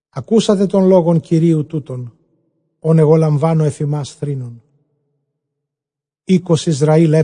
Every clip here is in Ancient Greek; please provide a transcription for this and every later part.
Ἀκούσατε τὸν λόγον Κυρίου τοῦτον, ὃν ἐγὼ λαμβάνω ἐφʼ ὑμᾶς, θρῆνον. Οἶκος Ἰσραὴλ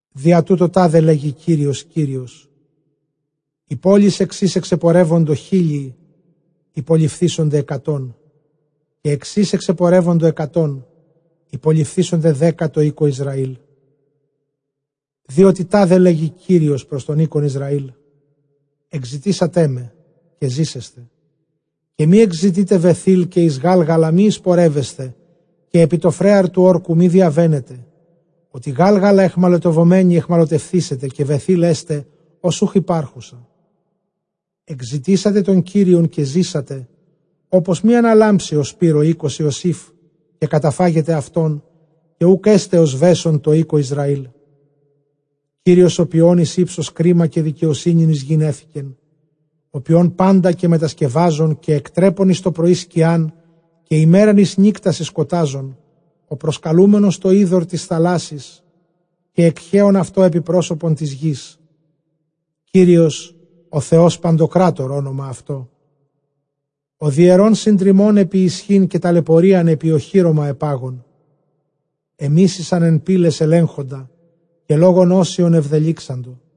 Διατοῦτο τάδε λέγει Κύριος Κύριος, ἡ πόλις ἐξ ἧς ἐξεπορεύοντο χίλιοι, ὑπολειφθήσονται ἑκατόν· καὶ ἐξ ἧς ἐξεπορεύοντο ἑκατὸν, ὑπολειφθήσονται δέκα τῷ οἴκῳ Ἰσραήλ. Διότι τάδε λέγει Κύριος πρὸς τὸν οἶκον Ἰσραὴλ, ἐκζητήσατέ με, καὶ ζήσεσθε. Καὶ μὴ ἐκζητεῖτε Βαιθὴλ, καὶ εἰς Γάλγαλα μὴ εἰσπορεύεσθε, καὶ ἐπὶ τὸ φρέαρ τοῦ ὅρκου μὴ διαβαίνετε, ὅτι Γάλγαλα αἰχμαλωτευομένη αἰχμαλωτευθήσεται, καὶ Βαιθὴλ ἔσται ὡς οὐχ ὑπάρχουσα. Ἐκζητήσατε τὸν Κύριον, καὶ ζήσατε, ὅπως μὴ ἀναλάμψῃ ὡς πῦρ ὁ οἶκος Ἰωσὴφ, καὶ καταφάγῃ αὐτὸν, καὶ οὐκ ἔσται ὁ σβέσων τῷ οἴκῳ Ἰσραήλ. Ὁ ποιῶν εἰς ὕψος κρίμα, καὶ δικαιοσύνην εἰς γῆν ἔθηκεν· ὁ ποιῶν πάντα καὶ μετασκευάζων, καὶ ἐκτρέπων εἰς τοπρωῒ σκιάν, καὶ ἡμέραν εἰς νύκτα συσκοτάζων, ὁ προσκαλούμενος τὸ ὕδωρ τῆς θαλάσσης, καὶ ἐκχέων αὐτὸ ἐπὶ πρόσωπον τῆς γῆς· Κύριος ὄνομα αὐτῷ· ὁ διαιρῶν συντριμμὸν ἐπὶ ἰσχὺν, καὶ ταλαιπωρίαν ἐπὶ ὀχύρωμα ἐπάγων. Ἐμίσησαν ἐν πύλαις ἐλέγχοντα, καὶ λόγον ὅσιον ἐβδελύξαντο.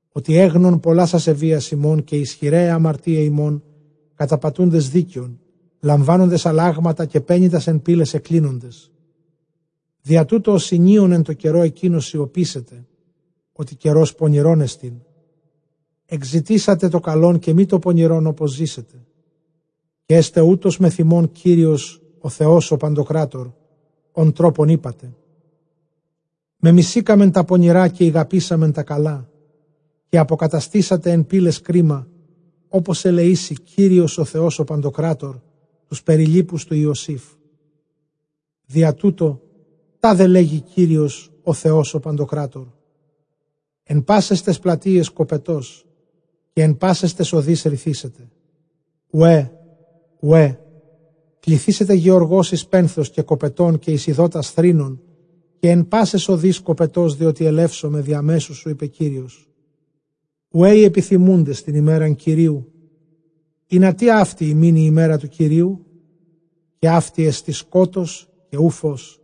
Ὅτι ἔγνων πολλὰς ἀσεβείας ὑμῶν, καὶ ἰσχυραὶ αἱ ἁμαρτίαι ὑμῶν, καταπατοῦντες δίκαιον, λαμβάνοντες ἀλλάγματα, καὶ πένητας ἐν πύλαις ἐκκλίνοντες. Διατοῦτο ὁ συνιὼν ἐν τῷ καιρῷ ἐκείνῳ σιωπήσεται, ὅτι καιρὸς πονηρῶν ἐστιν. Ἐκζητήσατε τὸ καλὸν, καὶ μὴ πονηρὸν, ὅπως ζήσητε, καὶ ἔσται οὕτως μεθʼ ὑμῶν Κύριος ὁ Θεὸς ὁ παντοκράτωρ, ὃν τρόπον εἴπατε, μεμισήκαμεν τὰ πονηρὰ, καὶ ἠγαπήσαμεν τὰ καλά· καὶ ἀποκαταστήσατε ἐν πύλαις κρίμα, ὅπως ἐλεήσῃ Κύριος ὁ Θεὸς ὁ παντοκράτωρ τοὺς περιλοίπους τοῦ Ἰωσήφ. Διατοῦτο τάδε λέγει Κύριος ὁ Θεὸς ὁ παντοκράτωρ, ἐν πάσαις ταῖς πλατείαις κοπετὸς, καὶ ἐν πάσαις ταῖς ὁδοῖς ῥηθήσεται οὐαὶ, οὐαί· κληθήσεται γεωργὸς εἰς πένθος καὶ κοπετὸν, καὶ εἰς εἰδότας θρῆνον. Καὶ ἐν πάσαις ὁδοῖς κοπετὸς, διότι ἐλεύσομαι διὰ μέσου σου, εἶπε Κύριος. Οὐαὶ οἱ ἐπιθυμοῦντες τὴν ἡμέραν Κυρίου· ἱνατί αὕτη ὑμῖν ἡ ἡμέρα τοῦ Κυρίου; καὶ αὕτη ἐστὶ σκότος καὶ οὐ φῶς.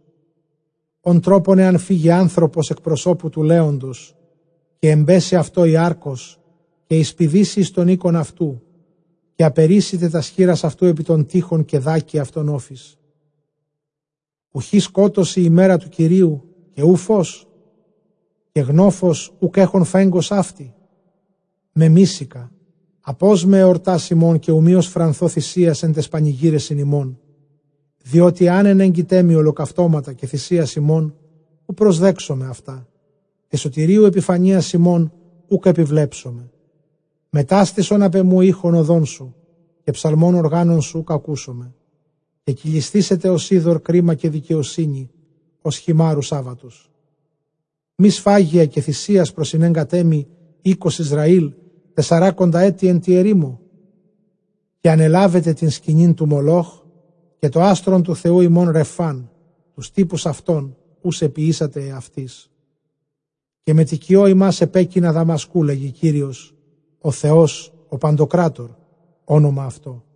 Ὃν τρόπον ἐὰν φύγῃ ἄνθρωπος ἐκ προσώπου τοῦ λέοντος, καὶ ἐμπέσῃ αὐτῷ ἡ ἄρκος, καὶ εἰσπηδήσῃ εἰς τὸν οἶκον αὐτοῦ, καὶ ἀπερείσηται τὰς χεῖρας αὐτοῦ ἐπὶ τὸν τοῖχον, καὶ δάκῃ αὐτὸν ὄφις. Οὐχὶ σκότος ἡ ἡμέρα τοῦ Κυρίου, καὶ οὐ φῶς, καὶ γνόφος οὐκ ἔχων φέγγος αὕτη; Μεμίσηκα, ἀπῶσμαι ἑορτὰς ὑμῶν, καὶ οὐ μὴ ὀσφρανθῶ θυσίας ἐν ταῖς πανηγύρεσιν ὑμῶν. Διότι ἐὰν ἐνέγκητέ μοι ὁλοκαυτώματα καὶ θυσίας ὑμῶν, οὐ προσδέξομαι, καὶ σωτηρίους ἐπιφανείας ὑμῶν οὐκ ἐπιβλέψομαι. Μετάστησον ἀπʼ ἐμοῦ ἦχον ᾠδῶν σου, καὶ ψαλμὸν ὀργάνων σου οὐκ ἀκούσομαι. Καὶ κυλισθήσεται ὡς ὕδωρ κρίμα, καὶ δικαιοσύνη ὡς χειμάῤῥους ἄβατος. Μὴ σφάγια καὶ θυσίας προσηνέγκατέ μοι οἶκος Ἰσραὴλ τεσσαράκοντα ἔτη ἐν τῇ ἐρήμῳ; Καὶ ἀνελάβετε τὴν σκηνὴν τοῦ Μολὸχ, καὶ τὸ ἄστρον τοῦ θεοῦ ὑμῶν Ῥαιφὰν, τοὺς τύπους αὐτῶν οὓς ἐποιήσατε ἑαυτοῖς. Καὶ μετοικιῶ ὑμᾶς ἐπέκεινα Δαμασκοῦ, λέγει Κύριος· ὁ Θεὸς ὁ παντοκράτωρ ὄνομα αὐτῷ.